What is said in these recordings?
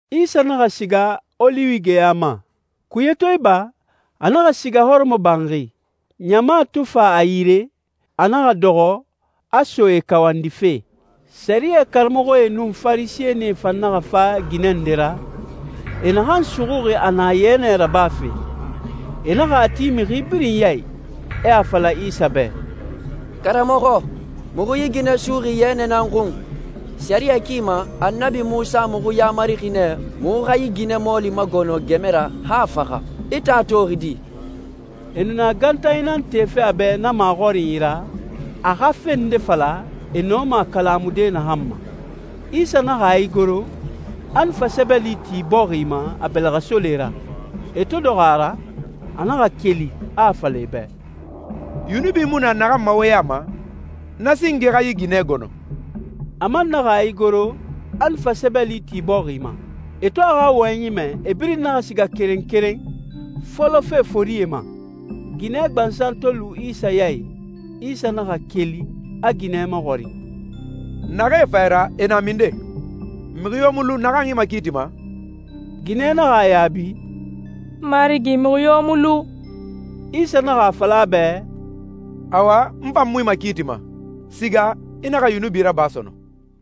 Isa naxa siga Oliwi geya ma. Kuye to iba, a naxa siga hɔrɔmɔbanxi. Ɲama to fa a yire, a naxa dɔxɔ, a so e kawandife. Sɛriyɛ karamɔxɔe nun Farisɛnie fan naxa fa ginɛ nde ra, e naxan suxuxi a na yɛnɛ rabafe. E naxa a ti mixi birin ya i, e a fala Isa bɛ, «Karamɔxɔ, muxu yi ginɛ suxuxi yɛnɛ nan xun. Sɛriyɛ ki ma, Annabi Munsa muxu yamarixi nɛ muxu xa yi ginɛ mɔɔli magɔnɔ gɛmɛ ra han a faxa. I tan a toxi di?» E nu na gantanyi nan tefe a bɛ na maxɔrinyi ra, a xa fe nde fala, e nɔma a kalamude naxan ma. Isa naxa a igoro, a nu fa sɛbɛli ti bɔxi ma a bɛlɛxɛsole ra. E to dɔxɔ a ra, a naxa keli, a a fala e bɛ, «Yunubi mu na naxan ma wo ya ma, na singe xa yi ginɛ gɔnɔ.» A man naxa a igoro, a nu fa sɛbɛli ti bɔxi ma. E to a xa wɔyɛnyi mɛ, e birin naxa siga keren keren, fɔlɔfe forie ma. Ginɛ gbansan to lu Isa ya i, Isa naxa keli, a ginɛ maxɔrin, «Naxee fa i ra, e na minden? Mixi yo mu lu naxan i makiitima?» Ginɛ naxa a yaabi, «N marigi, mixi yo mu lu.» Isa naxa a fala a bɛ, «Awa, n fan mu i makiitima. Siga, i naxa yunubi raba sɔnɔn.»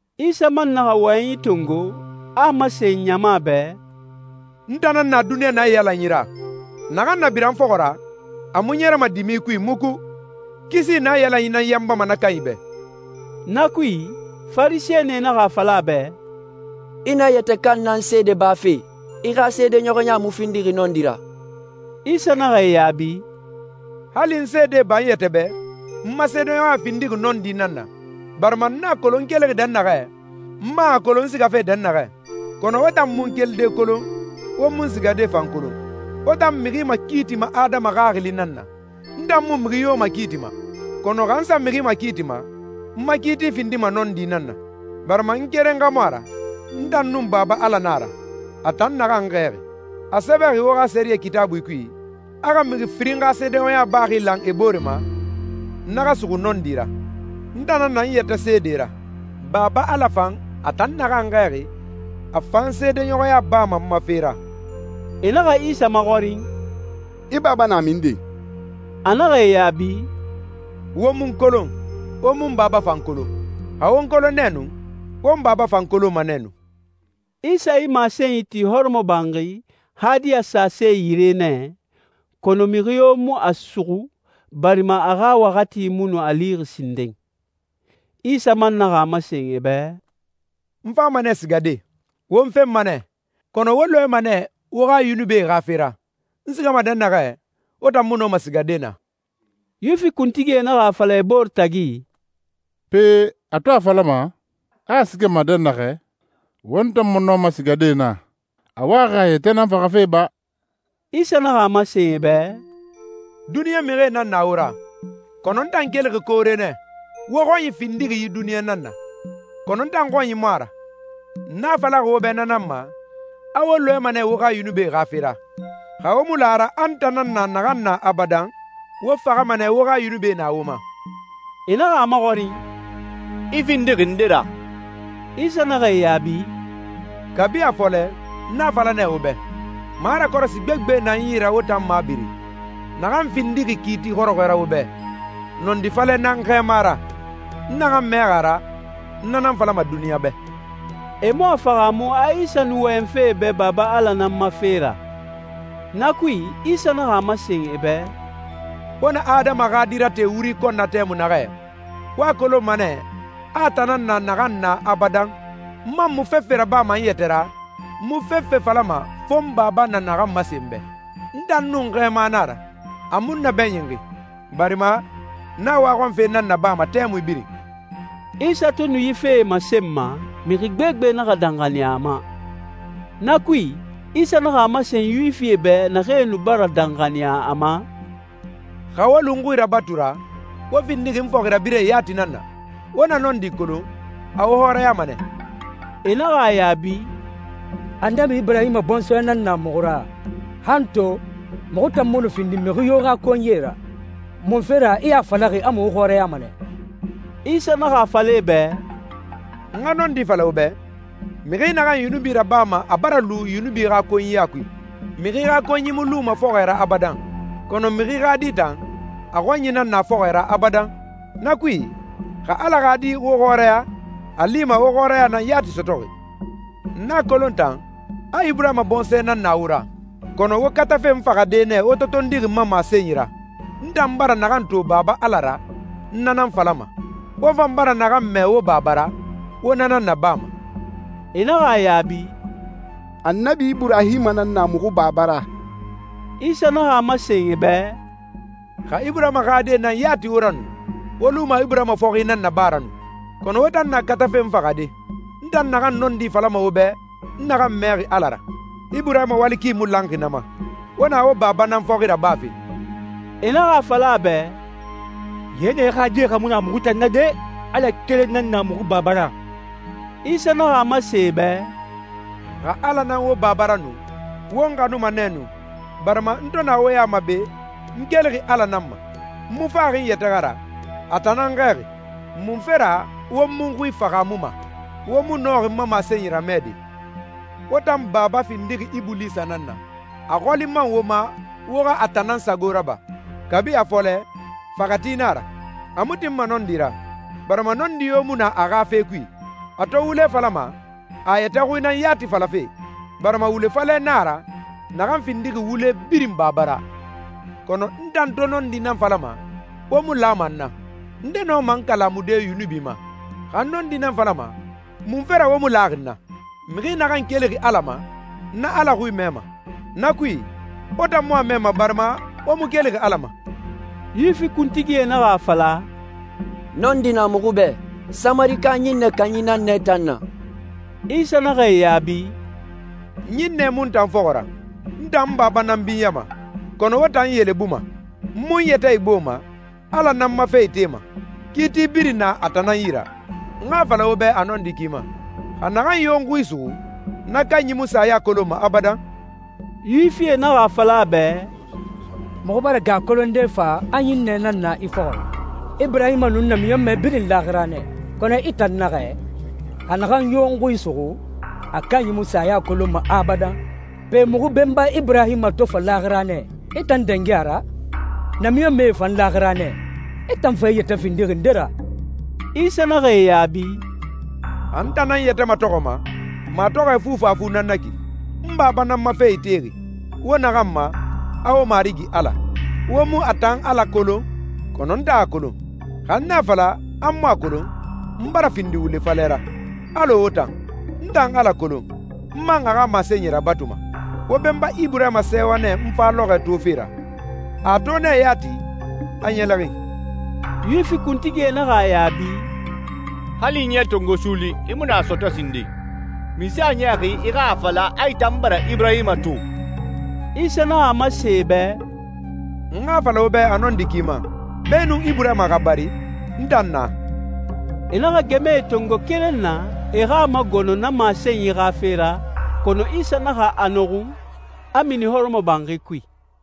Isa man naxa wɔyɛnyi tongo, a a masen ɲama bɛ, «N tan nan na duniɲa naiyalanyi ra. Naxan na bira n fɔxɔ ra, a mu ɲɛrɛma dimi kui muku. Kisi naiyalanyi nan yanbama na kanyi bɛ.» Na kui, Farisɛnie naxa a fala a bɛ, «I na i yɛtɛ kan nan seede bafe. I xa seedeɲɔxɔya mu findixi nɔndi ra.» Isa naxa e yaabi, «Hali n seede ba n yɛtɛ bɛ, n ma seedeɲɔxɔya findixi nɔndi nan na, barima n a kolon n kelixi dɛnnaxɛ, n man a kolon n sigafe dɛnnaxɛ. Kɔnɔ wo tan mu n kelide kolon, wo mu n sigade fan kolon. Wo tan mixi makiitima adama xaxili nan na. N tan mu mixi yo makiitima. Kɔnɔ xa n sa mixi makiitima, n ma kiiti findima nɔndi nan na, barima n keren xa mu a ra. N tan nun Baba Ala nan a ra, a tan naxan n xɛɛxi. A sɛbɛxi wo xa sɛriyɛ Kitaabui kui, a xa mixi firin xa seedeɲɔxɔya baxi lan e bore ma, na xa suxu nɔndi ra. N tan nan na n yɛtɛ seede ra. Baba Ala fan, a tan naxan n xɛɛxi, a fan seedeɲɔxɔya bama n ma fe ra.» E naxa Isa maxɔrin, «I baba na minden?» A naxa e yaabi, «Wo mu n kolon, wo mu n Baba fan kolon. Xa wo n kolon nɛ nu, wo n Baba fan kolonma nɛ nu.» Isa yi masenyi ti hɔrɔmɔbanxi, hadiya sase yire nɛ, kɔnɔ mixi yo mu a suxu, barima a xa waxati mu nu a lixi sinden. Isa man naxa a masen e bɛ, «N fama nɛ sigade. Wo n fenma nɛ, kɔnɔ wo lɔɛma nɛ wo xa yunubie xa fe ra. N sigama dɛnnaxɛ, wo tan mu nɔma sigade naa.» Yuwifi kuntigie naxa a fala e bore tagi, «Pe, a to a falama, a a sigama dɛnnaxɛ, won tan mu nɔma sigade naa, a waxi a yɛtɛ nan faxafe ba?» Isa naxa a masen e bɛ, «Duniɲa mixie nan na wo ra. Kɔnɔ n tan kelixi koore nɛ. Wo xɔnyi findixi yi duniɲa nan na, kɔnɔ n tan xɔnyi mu a ra. N a falaxi wo bɛ na nan ma, a wo lɔɛma nɛ wo xa yunubie xa fe ra. Xa wo mu la a ra, a n tan nan na naxan na abadan, wo faxama nɛ wo xa yunubie na wo ma.» E naxa a maxɔrin, «I findixi nde ra?» Isa naxa e yaabi, «Kabi a fɔlɛ, n na falama wo bɛ. Marakɔrɔsi gbegbe nan n yi ra wo tan mabiri, naxan findima kiiti xɔrɔxɔɛ ra wo bɛ. Nɔndi falɛ nan n Xɛɛma ra. N naxan mɛxi a ra, n na nan falama duniɲa bɛ.» E mu a fahaamu a Isa nu wɔyɛnfe e bɛ Baba Ala nan ma fe ra. Na kui, Isa naxa a masen e bɛ, «Wo na Adama xa Di rate wuri kɔn na tɛmui naxɛ, wo a kolonma nɛ, a n tan nan na naxan na abadan, n man mu fefe rabama n yɛtɛ ra, n mu fefe falama fo n Baba na naxan masen n bɛ. N tan nun n Xɛɛma nan a ra. A mu n nabɛɲinxi, barima n a waxɔnfe nan nabama tɛmui birin.» Isa to nu yi fee masenma, mixi gbegbe naxa danxaniya a ma. Na kui, Isa naxa a masen Yuwifie bɛ naxee nu bara danxaniya a ma, «Xa wo lu n xui rabatu ra, wo findixi n fɔxirabirɛe yati nan na. Wo na nɔndi kolon, a wo xɔrɛyama nɛ.» E naxa a yaabi, «Annabi Iburahima bɔnsɔɛ nan na muxu ra. Han to, muxu tan mu nu findi mixi yo xa konyie ra! Munfe ra i a falaxi a muxu xɔrɛyama nɛ?» Isa naxa a fala e bɛ, «N xa nɔndi fala wo bɛ, mixi naxan yunubi rabama a bara lu yunubi xa konyiya kui. Mixi xa konyi mu luma fɔxɔɛ ra abadan. Kɔnɔ mixi xa di tan, a xɔnyi nan na fɔxɔɛ ra abadan. Na kui, xa Ala xa Di wo xɔrɛya, a lima wo xɔrɛya nan yati sɔtɔxi.» «N a kolon tan, a Iburahima bɔnsɔɛ nan na wo ra, kɔnɔ wo katafe n faxade nɛ wo to tondixi n ma masenyi ra. N tan bara naxan to Baba Ala ra, n na nan falama. Wo fan bara naxan mɛ wo baba ra, wo na nan nabama.» E naxa a yaabi, «Annabi Iburahima nan na muxu baba ra.» Isa naxa a masen e bɛ, «Xa Iburahima xa die nan yati wo ra nu, wo luma Iburahima fɔxi nan naba ra nu. Kɔnɔ wo tan na katafe n faxade, n tan naxan nɔndi falama wo bɛ n naxan mɛxi Ala ra. Iburahima wali ki mu lanxi na ma. Wo na wo baba nan fɔxi rabafe.» E naxa a fala a bɛ, «Yɛnɛ die xa mu na muxu tan na de! Ala keren nan na muxu Baba ra.» Isa naxa a masen e bɛ, «Xa Ala nan wo Baba ra nu, wo n xanuma nɛ nu, barima n to na wo ya ma be, n kelixi Ala nan ma. N mu faxi n yɛtɛ xa ra, a tan nan n xɛɛxi. Munfe ra wo mu n xui fahaamuma? Wo mu nɔxi n ma masenyi ramɛde. Wo tan baba findixi Ibulisa nan na, a xɔli man wo ma wo xa a tan nan sago raba. Kabi a fɔlɛ, faxɛti nan a ra. A mu tinma nɔndi ra, barima nɔndi yo mu na a xa fe kui. A to wule falama, a a yɛtɛ xui nan yati falafe, barima wule falɛ nan a ra naxan findixi wule birin baba ra. Kɔnɔ n tan to nɔndi nan falama, wo mu lama n na. Nde nɔma n kalamude yunubi ma? Xa n nɔndi nan falama, munfe ra wo mu laxi n na? Mixi naxan kelixi Ala ma, na Ala xui mɛma. Na kui, wo tan mu a mɛma barima wo mu kelixi Ala ma.» Yuwifi kuntigie naxa a fala, «Nɔndi na muxu bɛ. Samarika ɲinnɛ kanyi nan i tan na.» Isa naxa e yaabi, «Ɲinnɛ mu n tan fɔxɔ ra. N tan n Baba nan binyama, kɔnɔ wo tan n yelebuma. N mu n yɛtɛ igboma. Ala nan n ma fe itema. Kiiti birin na a tan nan yi ra. N xa a fala wo bɛ a nɔndi ki ma, xa naxan yo n xui suxu, na kanyi mu saya kolonma abadan.» Yuwifie naxa a fala a bɛ, «Muxu bara gɛ a kolonde fa a ɲinnɛ nan na i fɔxɔ ra. Iburahima nun namiɲɔnmɛe birin laaxira nɛ, kɔnɔ i tan naxɛ, ‹Xa naxan yo n xui suxu, a kanyi mu saya kolonma abadan.› Pe, muxu benba Iburahima to fa laaxira nɛ, i tan dangi a ra? Namiɲɔnmɛe fan laaxira nɛ. I tan fa i yɛtɛ findixi nde ra?» Isa naxa e yaabi, «Xa n tan nan n yɛtɛ matɔxɔma, matɔxɔɛ fufafu nan na ki. N Baba nan n ma fe itexi, wo naxan ma, a wo Marigi Ala! Wo mu a tan Ala kolon, kɔnɔ n tan a kolon. Xa n a fala, a n mu a kolon, n bara findi wule falɛ ra, alɔ wo tan. N tan Ala kolon, n man a xa masenyi rabatuma. Wo benba Iburahima sɛɛwa nɛ n fa lɔxɔɛ tofe ra. A a to nɛ yati, a ɲɛlɛxin.» Yuwifi kuntigie naxa a yaabi, «Hali ɲɛ tongo suuli, i mu nu a sɔtɔ sinden. Munse a niyaxi i xa a fala a i tan bara Iburahima to?» Isa naxa a masen e bɛ, «N xa a fala wo bɛ a nɔndi ki ma, beenun Iburahima xa bari, n tan na.» E naxa gɛmɛe tongo keren na, e xa a magɔnɔ na masenyi xa fe ra, kɔnɔ Isa naxa a nɔxun, a mini hɔrɔmɔbanxi kui.